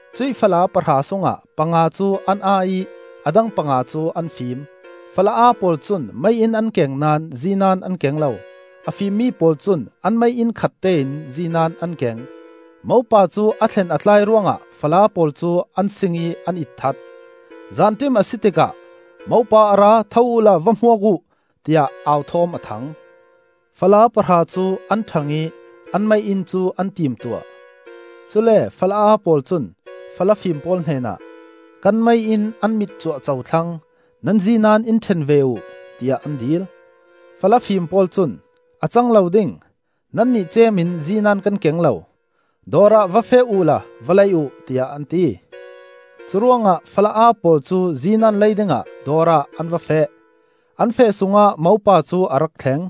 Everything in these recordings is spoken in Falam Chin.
Cuih fala pahra sungah panga cu an aa ih a dang panga cu an fim. Fala aa pawl cun mei-inn an keng naón zinan an keng lo. A fimmi pawl cun an mei-inn khattein zinan an keng. Mopa cu a thlen a tlai ruangah fala pawl cu an sing ih an itthat. “Zanṭim a si tikah, ‘Mopa a ra! Tho uhla va hmuak uh,’ tiah au thawm a thang. Fala pahra cu an ṭhang ih an mei-inn cu an timtuah. Cule fala aa pawl cun fala fim pawl hnenah, ‘Kan mei-inn an mit cuahco thlang, nan zinan in ṭhen ve uh,’ tiah an dil. Fala fim pawl cun, ‘A cang lo ding, nannih ceem in zinan kan keng lo. Dawr ah va feh uhla va lei uh,’ tiah an ti. Curuangah fala aa pawl cu zinan lei dingah dawr ah an va feh; an feh sungah mopa cu a rak thleng.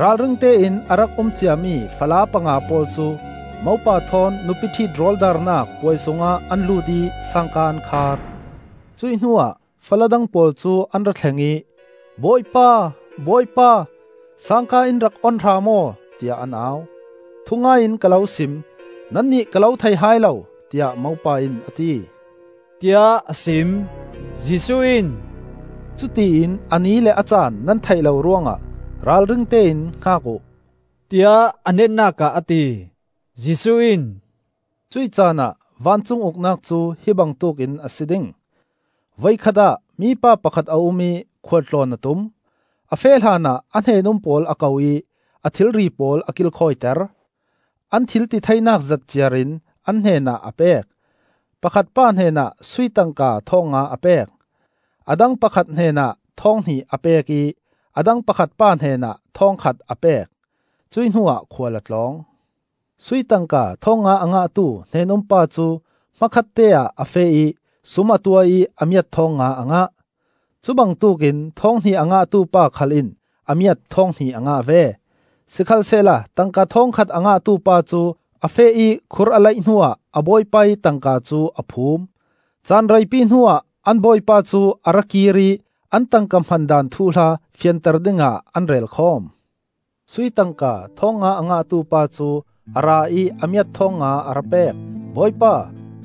Ralringte in a rak um ciami fala panga pawl cu mopa thawn nupiṭhit rawldarnak puai sungah an lut ih sangka an khar. “Cuih hnuah fala dang pawl cu an ra thleng ih ‘Bawipa, bawipa, sangka in rak on hram aw,’ tiah an au. ‘Thungai in ka lo sim: nannih ka lo thei hai lo,’ tiah mopa in a ti,” tiah a sim. Jesuh in, “Cutiin a ni le a caan nan theih lo ruangah ralringte in hngak uh,” tiah a netnak ah a ti. Jesuh in, “Cuih caanah vancung Uknak cu hi bangtuk in a si ding. Voikhat ah mipa pakhat a um ih khual tlawn a tum. A feh hlanah a hnen-um pawl a ko ih a thilri pawl a kilkhawiter. An thil titheinak zat ciarin an hnenah a pek: pakhat pa hnenah sui tangka thawng nga a pek, a dang pakhat hnenah thawng hnih a pek ih a dang pakhat pa hnenah thawng khat a pek. Cuih hnuah khual a tlawng. Sui tangka thawng nga a ngahtu hnen-um pa cu hmakhatte ah a feh ih sum a tuah ih a miat thawng nga a ngah. Cubangtuk in thawng hnih a ngahtu pa khal in a miat thawng hnih a ngah ve. Sikhalsehla tangka thawng khat a ngahtu pa cu a feh ih khur a laih hnuah a bawipa ih tangka cu a phum. “Caan reipi hnuah an bawipa cu a ra kir ih an tangka hman daan thuhla fianter dingah an rel khawm. Sui tangka thawng nga a ngahtu pa cu a ra ih a miat thawng nga a ra pek. ‘Bawipa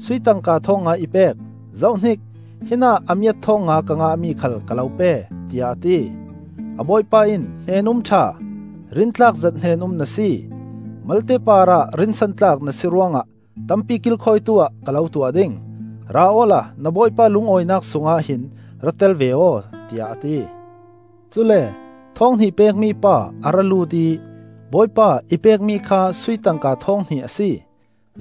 sui tangka thawng nga i pek. Zohhnik! Hinah a miat thawng nga ka ngahmi khal ka lo pe,’ tiah a ti. A bawipa in ‘Hnen-um ṭha, rintlak zet hnen-um na si! Malte parah rinsantlak na si ruangah tampi kilkhawitu-ah ka lo tuah ding. Ra awla na bawipa lungawinak sungah hin ra tel ve aw,’ tiah a ti. Cule thawng hnih pekmi pa a ra lut ih ‘Bawipa i pekmi kha sui tangka thawng hnih a si.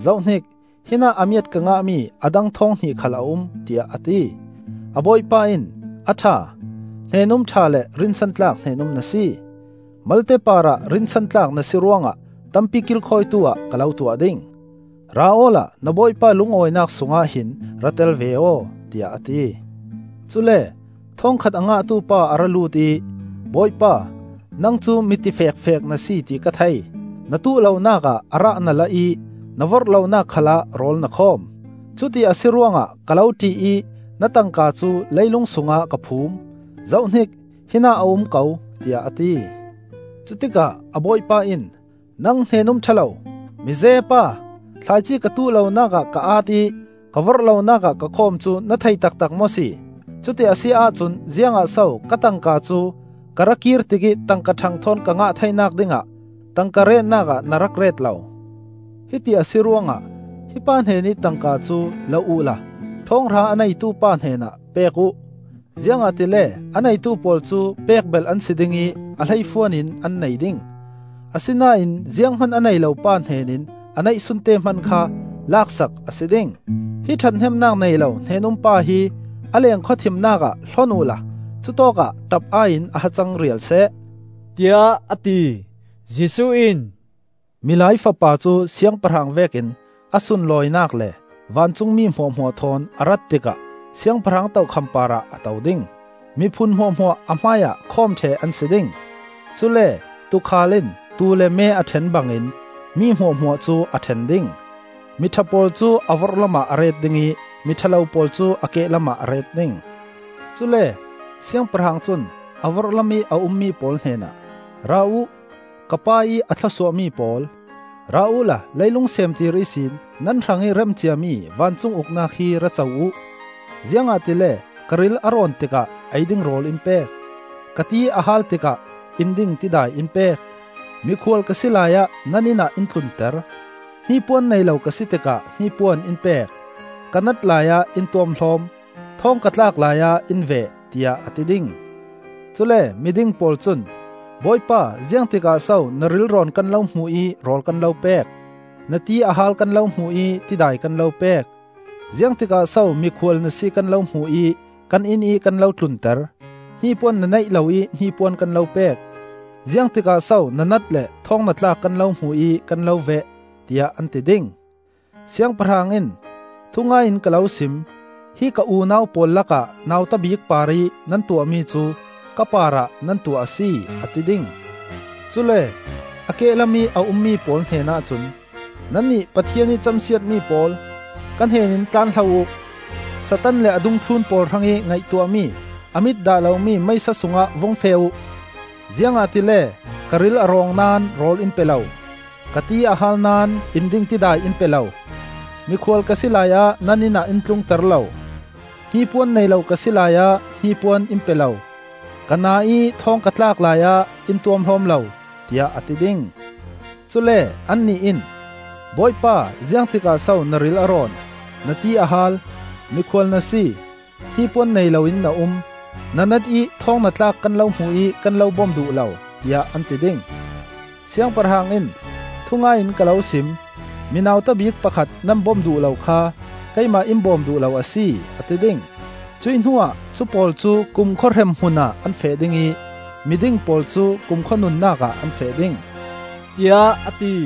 Zohhnik! Hinah a miat ka ngahmi a dang thawng hnih khal a um,’ tiah a ti. A bawipa in ‘A ṭha, hnen-um ṭha le rinsantlak hnen-um na si. Malte parah rinsantlak na si ruangah tampi kilkhawitu-ah ka lo tuah ding. Ra awla na bawipa lungawinak sungah hin ra tel ve aw,’ tiah a ti. Cule thawng khat a ngahtu pa a ra lut ih ‘Bawipa, nang cu mi tifekfek na si ti ka thei; na tuh lonak ah a rah na la ih na vorh lonak khalah rawl na khawm. Cuti a si ruangah ka lo ṭih ih na tangka cu leilung sungah ka phum. Zohhnik! Hinah a um ko,’ tiah a ti. Cutikah a bawipa in ‘Nang hnen-um ṭha lo, mi zee pa! Thlaici ka tuh lonak ah ka aat ih ka vorh lonak ah ka khawm cu na thei taktak maw si? Cuti a si ahcun ziangah so ka tangka cu ka ra kir tikih tangka ṭhang thawn ka ngah theinak dingah tangka retnak ah na rak ret lo? Hiti a si ruangah hi pa hnenih tangka cu la uhla thawng hra a neitu pa hnenah pek uh. Ziangahtile a neitu pawl cu pek belh an si ding ih a hleifuan in an nei ding. Asinain zianghman a nei lo pa hnen in a neihsunte hman kha lak sak a si ding. Hi ṭhathnemnak nei lo hnen-um pa hi a leng khawthimnak ah hlon uhla cutawkah ṭap-ai in a hacang rial seh,’ tiah a ti. Jesuh in, “Milai Fapa cu Siangpahrang vekin a sunlawinak le vancungmi hmuahhmuah thawn a rat tikah siangpahrang tokham parah a to ding. Miphun hmuahhmuah a hmaiah khawm ṭheh an si ding. Cule tuukhal in tuu le me a ṭhen bangin mi hmuahhmuah cu a ṭhen ding. Mi ṭha pawl cu a vorhlam ah a ret ding ih mi ṭha lo pawl cu a kehlam ah a ret ding. Cule Siangpahrang cun a vorhlamih a ummi pawl hnenah ‘Ra uh, ka Pa ih a thlawsuahmi pawl! Ra uhla leilung seemtir ihsin nan hrangih rem ciami vancung Uknak hi ra co uh. Ziangahtile ka ril a rawn tikah ei ding rawl in pek; ka ti a haal tikah in ding tidai in pek; mikhual ka si laiah nan inn ah in tlunter; hnipuan nei lo ka si tikah hnipuan in pek; ka nat laiah in tuamhlawm; thawng ka tlak laiah in veh,’ tiah a ti ding. Cule miding pawl cun, ‘Bawipa ziangtikah so na rilrawn kan lo hmuh ih rawl kan lo pek; na ti a haal kan lo hmuh ih tidai kan lo pek? Ziangtikah so mikhual na si kan lo hmuh ih kan innih kan lo tlunter; hnipuan na neih loih hnipuan kan lo pek? Ziangtikah so na nat le thawng na tlak kan lo hmuh ih kan lo veh?’ tiah an ti ding. Siangpahrang in, ‘Thungai in ka lo sim: hi ka unau pawl lakah nauta bik parih nan tuahmi cu ka parah nan tuah a si,’ a ti ding. “Cule a kehlam ih a ummi pawl hnenah cun ‘Nannih Pathian ih camsiatmi pawl, ka hnen in tlanhlo uh. Satan le a dungthlun pawl hrangih ngaihtuahmi a mit dah lomi meisa sungah vung feh uh. Ziangahtile ka ril a rawng naón rawl in pe lo; ka ti a hal naón in ding tidai in pe lo; mikhual ka si laiah nan inn ah in tlungter lo; hnipuan nei lo ka si laiah hnipuan in pe lo; ka naa ih thawng ka tlak laiah in tuamhlawm lo,’ tiah a ti ding. Cule annih in ‘Bawipa, ziangtikah so na ril a rawn, na ti a haal, mikhual na si, hnipuan nei lo in na um, na nat i thawng na tlak kan lo hmuh ih kan lo bom duh lo?’ tiah an ti ding. Siangpahrang in, ‘Thungai in ka lo sim: mi nauta bik pakhat nan bom duh lo kha, keimah in bawm duh lo a si,’ a ti ding. Cuih hnuah cupawl cu kumkhua hrem hmun ah an feh ding ih mi ding pawl cu kumkhua nunnak ah an feh ding,” tiah a ti.